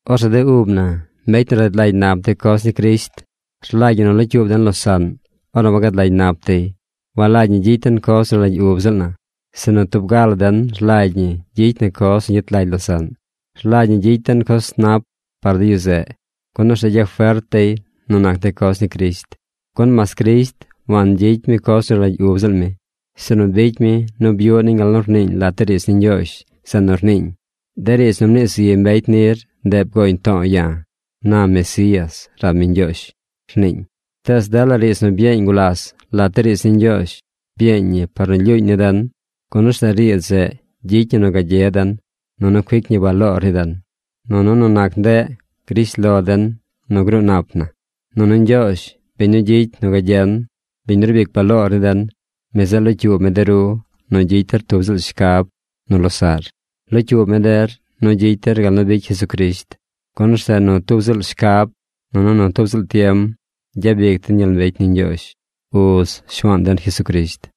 Orzeꞌ de ub na, mbecy nu rad lagy nap de coz ni Crisht, rlagy ñi nu locyuub den losaꞌn ornu wagad lagy nap dey. Walagy ñi gyicy den coz nu rlagy ub ziꞌl na, sinu tub ga la den rlagy ñi gyicy na coz nu gyet lagy losaꞌn. Rlagy ñi gyicy den coz nu nap par de yu zeꞌ, gun orzeꞌ gyafert dey nu nac de coz ni Crisht. Gun mas Crisht wangyicy mi coz nu rlagy ub ziꞌl mi, sinu bicy mi nu byuꞌ niñ gal nu rniiñ lat de riidz ni Ñgyoozh zeꞌ nu rniiñ: “De riidz nu mnii zi mbecy nir, ndeꞌ bgoñ to̱o̱ ya̱, na Mesías rab mi Ñgyoozh”, rniiñ. Tees dela riidz nu byeeñ gulas lat de riidz ni Ñgyoozh, byeeñ ñi par nu lyuuñ ni den, gun orzeꞌ riidz zeꞌ gyicy ñi nu gagye den, nunu cuic ñi baloor ni den. Nunu nu nac ndeꞌ grish lo den nu ruu nap na. Nunu Ñgyoozh, biñ nu gyicy nu gagyen, biñ nu rbic baloor ni den, mi zeꞌ locyuub mi de ru nu gyicy der tub ziꞌl shcab nu losaꞌr. Locyuub mi der nu gyicy der gal nu bicy Jesucrisht. Gun orzeꞌ nu tub ziꞌl shcab, nunu tub ziꞌl tiem gyabic den gyel mbecy ni Ñgyoozh, Uz Shuaan den Jesucrisht.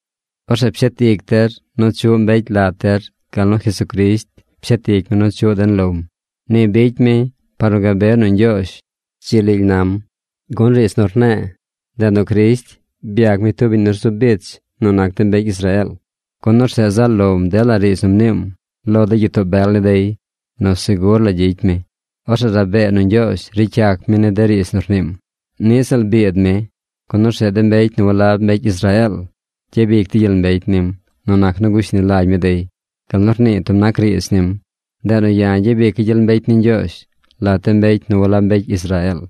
Orzeꞌ pshet ic der nu chuꞌ mbecy lat der gal nu Jesucrisht pshet ic mi nu chuꞌ den lom. Ni bicy mi par nu gabe nu Ñgyoozh dzi lily nam. Gun riidz nu rne̱e̱, ndeꞌ nu Crisht byac mi tub biñ nu rzu bich nu nac de mbecy Israeel, gun orzeꞌ zaꞌ lom dela riidz nu mniim lo de gyitoo bel ni dey nu segur la gyicy mi. Orzeꞌ rabee nu Ñgyoozh ricy yac mi ni de riidz nu rniim. Niꞌ ziꞌl biid mi, gun orzeꞌ de mbecy nu walab mbecy Israeel gyabic dey gyel mbecy nim nu nac nu gushni lagy mi dey, gal nu rnii tub nac riidz nim: Ndeꞌ nu ya̱ gyabica̱ gyel mbecy ni Ñgyoozh lat de mbecy nu walab mbecy Israeel,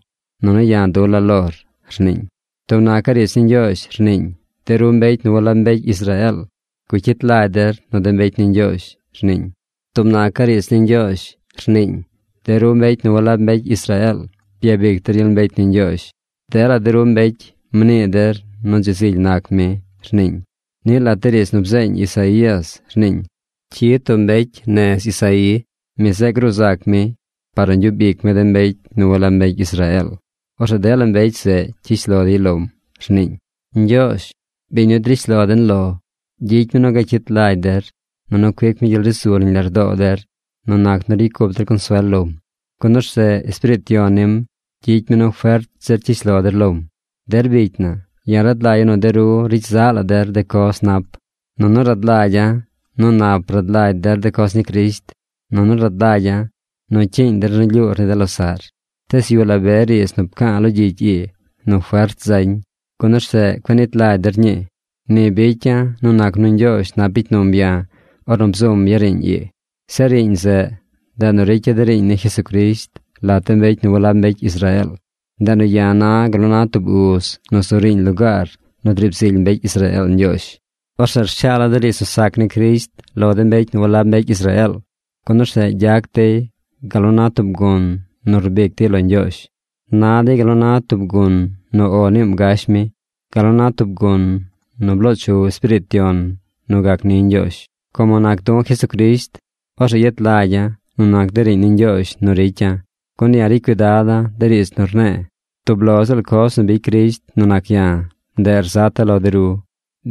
nunu ya̱ dula̱ lor, rniiñ. Tub nacaꞌ riidz ni Ñgyoozh rniiñ: De ru mbecy nu walab mbecy Israeel, gucyit lagy der nu de mbecy ni Ñgyoozh, rniiñ. Tub nacaꞌ riidz ni Ñgyoozh rniiñ: De ru mbecy nu walab mbecy Israeel, byabic der gyel mbecy ni Ñgyoozh. Dela de ru mbecy mnii der nu dzi zily nac mi, rniiñ. Niꞌ lat de riidz nu bzeeñ Isaías rniiñ: Cyid tub mbecy nez Isaí. Mi zeꞌ gruu zac mi par nu gyub ic mi de mbecy nu walab mbecy Israeel. Orzeꞌ dela mbecy zeꞌ cyish lo dey lom, rniiñ. Ñgyoozh, biñ nu drish lo den lo, gyicy mi nu gacyit lagy der, nunu cuic mi gyel ri zu nañ lardoo der nu nac nu ricy cup der consuel lom, gun orzeꞌ Espiriit Yon nim gyicy mi nu fert zir cyish lo der lom. Der bicy na, ya̱ rad lagya̱ nu de ru ricy zaꞌ la der de coz nap, nunu rad lagya̱ nu nap rad lagy der de coz ni Crisht, nunu rad lagya̱ nu cyiiñ der nu lyuur ni de losaꞌr. Tees yuꞌ la be riidz nu pca̱a̱ lo gyicy ii nu fert zañ, gun orzeꞌ cueꞌ nit lagy der ñii. Ni bicya̱ nu nac nu Ñgyoozh nap bicy num ya̱ ornu bzum ya̱ riiñ ii. Zeꞌ riiñ zeꞌ, ndeꞌ nu ricya̱ de riiñ ni Jesucrisht lat de mbecy nu walab mbecy Israeel. Ndeꞌ nu ya̱ na gal na tub uz nu zu riiñ lugaar nu driib zily mbecy Israeel Ñgyoozh. Orzeꞌ rshaala̱ de riidz nu sac ni Crisht lo de mbecy nu walab mbecy Israeel, gun orzeꞌ gyac dey gal nu na tub gun nu rbic dey lo Ñgyoozh. Na dey gal nu na tub gun nu “O” niim gash mi, gal na tub gun nu bloo chu Espiriit Yon nu gac ni Ñgyoozh. Como nac du̱ Jesucrisht, orzeꞌ yet lagya̱ nu nac de riiñ ni Ñgyoozh nu ricya̱. Gun ya̱ ricy cuidada̱ de riidz nu rne̱e̱. Tub lo ziꞌl coz nu bicy Crisht nu nac ya̱, ndeꞌ rzata̱ lo de ru.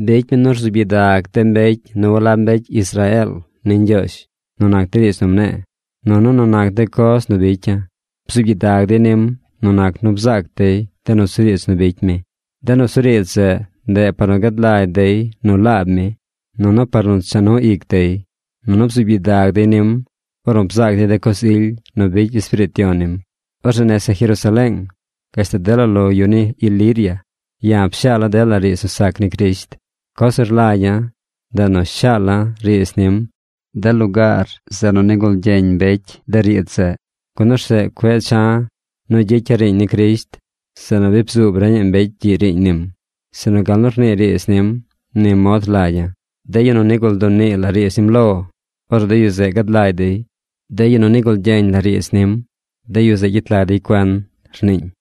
Bicy mi nu rzuub gyidag de mbecy nu walab mbecy Israeel ni Ñgyoozh nu nac de riidz nu mne̱e̱, nunu nu nac de coz nu bicya̱. Bzuub gyidag dey nim nu nac nu bzaac dey de nusuriidz nu bicy mi. De nusuriidz zeꞌ, ndeꞌ par nu gad lagy dey nu laab mi, nunu par nu cha nu ic dey. Nunu bzuub gyidag dey nim ornu bzaac dey de coz ily nu bicy Espiriit Yon nim. Orzeꞌ nese Jerusaleeng, gashtal dela lo yu ni Iliria ya̱ pshaala̱ dela riidz nu sac ni Crisht. Coz nu rlagya̱, ndeꞌ nu shaala̱ riidz nim de lugaar nu nigul gyeñ mbecy de riidz zeꞌ, gun orzeꞌ cueꞌ cha̱ nu gyicya̱ riiñ ni Crisht zeꞌ nu bi bzuub reñaꞌ mbecy gyiꞌ riiñ nim. Sinu gal nu rnii riidz nim, ni mod rlagya̱: De yu nu nigul dunii la riidz nim lo, orzeꞌ de yu zeꞌ gad lagy dey. De yu nu nigul gyeñ la riidz nim, de yu zeꞌ gyet lagy dey cuen, rniiñ.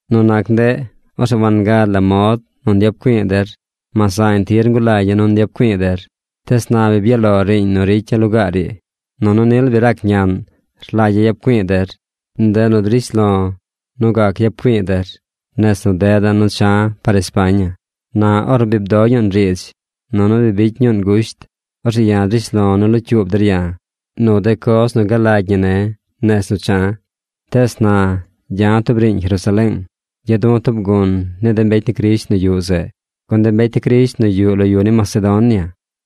Nu nac ndeꞌ, orzeꞌ wangad la mod nu nyap güi̱i̱ der mas zañ tir ngulagya̱ nu nyap güi̱i̱ der. Tees na bi byaꞌ lo riiñ nu ricya̱ lugaar ii. Nunu nil bi rac ñaꞌn rlagya̱ yap güi̱i̱ der. Ndeꞌ nu drish lo̱ nu gac yap güi̱i̱ der nez nu deda̱ nu cha̱ par España. Na ornu bi bdo ñuun riidz, nunu bi bicy ñuun gusht, orzeꞌ ya̱ drish lo̱ nu locyuub der ya̱ nu de coz nu galagy ñi ne̱ nez nu cha̱. Tees na gya̱ tub riiñ Jerusaleeng. Gya̱ du̱ tub gun ni de mbecy ni Crisht nu yuꞌ zeꞌ. Gun de mbecy ni Crisht nu yuꞌ lo yu ni Macedonia,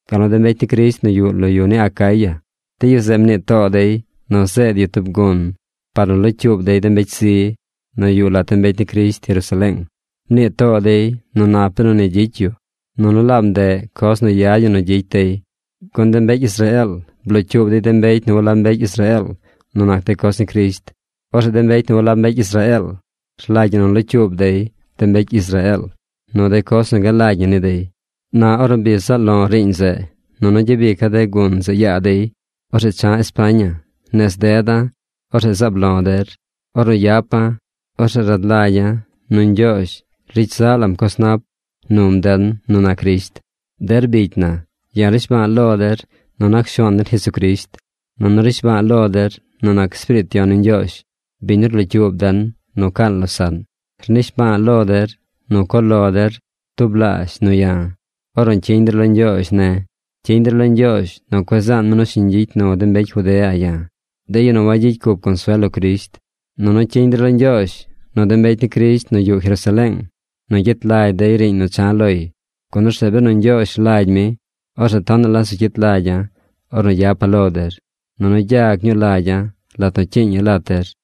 gal nu de mbecy ni Crisht nu yuꞌ lo yu ni Acaya, de yu zeꞌ mnii too dey nu zeed yu tub gun par nu locyuub dey de mbecy zi nu yuꞌ lat de mbecy ni Crisht Jerusaleeng. Mnii too dey nu nap benu ni gyicy yu, nunu laab ndeꞌ coz nu yad ñi nu gyicy dey, gun de mbecy Israeel blocyuub dey de mbecy nu walab mbecy Israeel nu nac de coz ni Crisht. Orzeꞌ de mbecy nu walab mbecy Israeel rlagy ñi nu locyuub dey de mbecy Israeel nu de coz nu galagy ñi ni dey. Na ornu bi zaꞌ lo̱ꞌ riiñ zeꞌ, nunu gyabica̱ de gun zeꞌ yaa dey, orzeꞌ cha̱ España. Nez deda̱, orzeꞌ zaab lo̱ der. Ornu yapa̱, orzeꞌ rad lagya̱ nu Ñgyoozh ricy zaꞌ lam coz nap num den nu nac Crisht. Der bicy na, ya̱ rnishba̱a̱ lo der nu nac Shuaan den Jesucrisht, nunu rnishba̱a̱ lo der nu nac Espiriit Yon ni Ñgyoozh biñ nu rlocyuub den nu caan losaꞌn. Rnishba̱a̱ lo der nu co lo der tublaazh nu ya̱ ornu cyiñ der lo Ñgyoozh ne̱. Cyiñ der lo Ñgyoozh nu cueꞌ zaan mi nu shiñ gyicy nu de mbecy Judea ya̱, de yu nu wagyicy cup consuel lo Crisht. Nunu cyiñ der lo Ñgyoozh nu de mbecy ni Crisht nu yuꞌ Jerusaleeng nu gyet lagy dey riiñ nu cha̱ loy. Gun orzeꞌ benu Ñgyoozh rlagy mi, orzeꞌ tonaꞌ la zu cyit lagya̱ ornu yapa̱ lo der, nunu gyag ñuu lagya̱ lat nu cyiiña̱ lat der.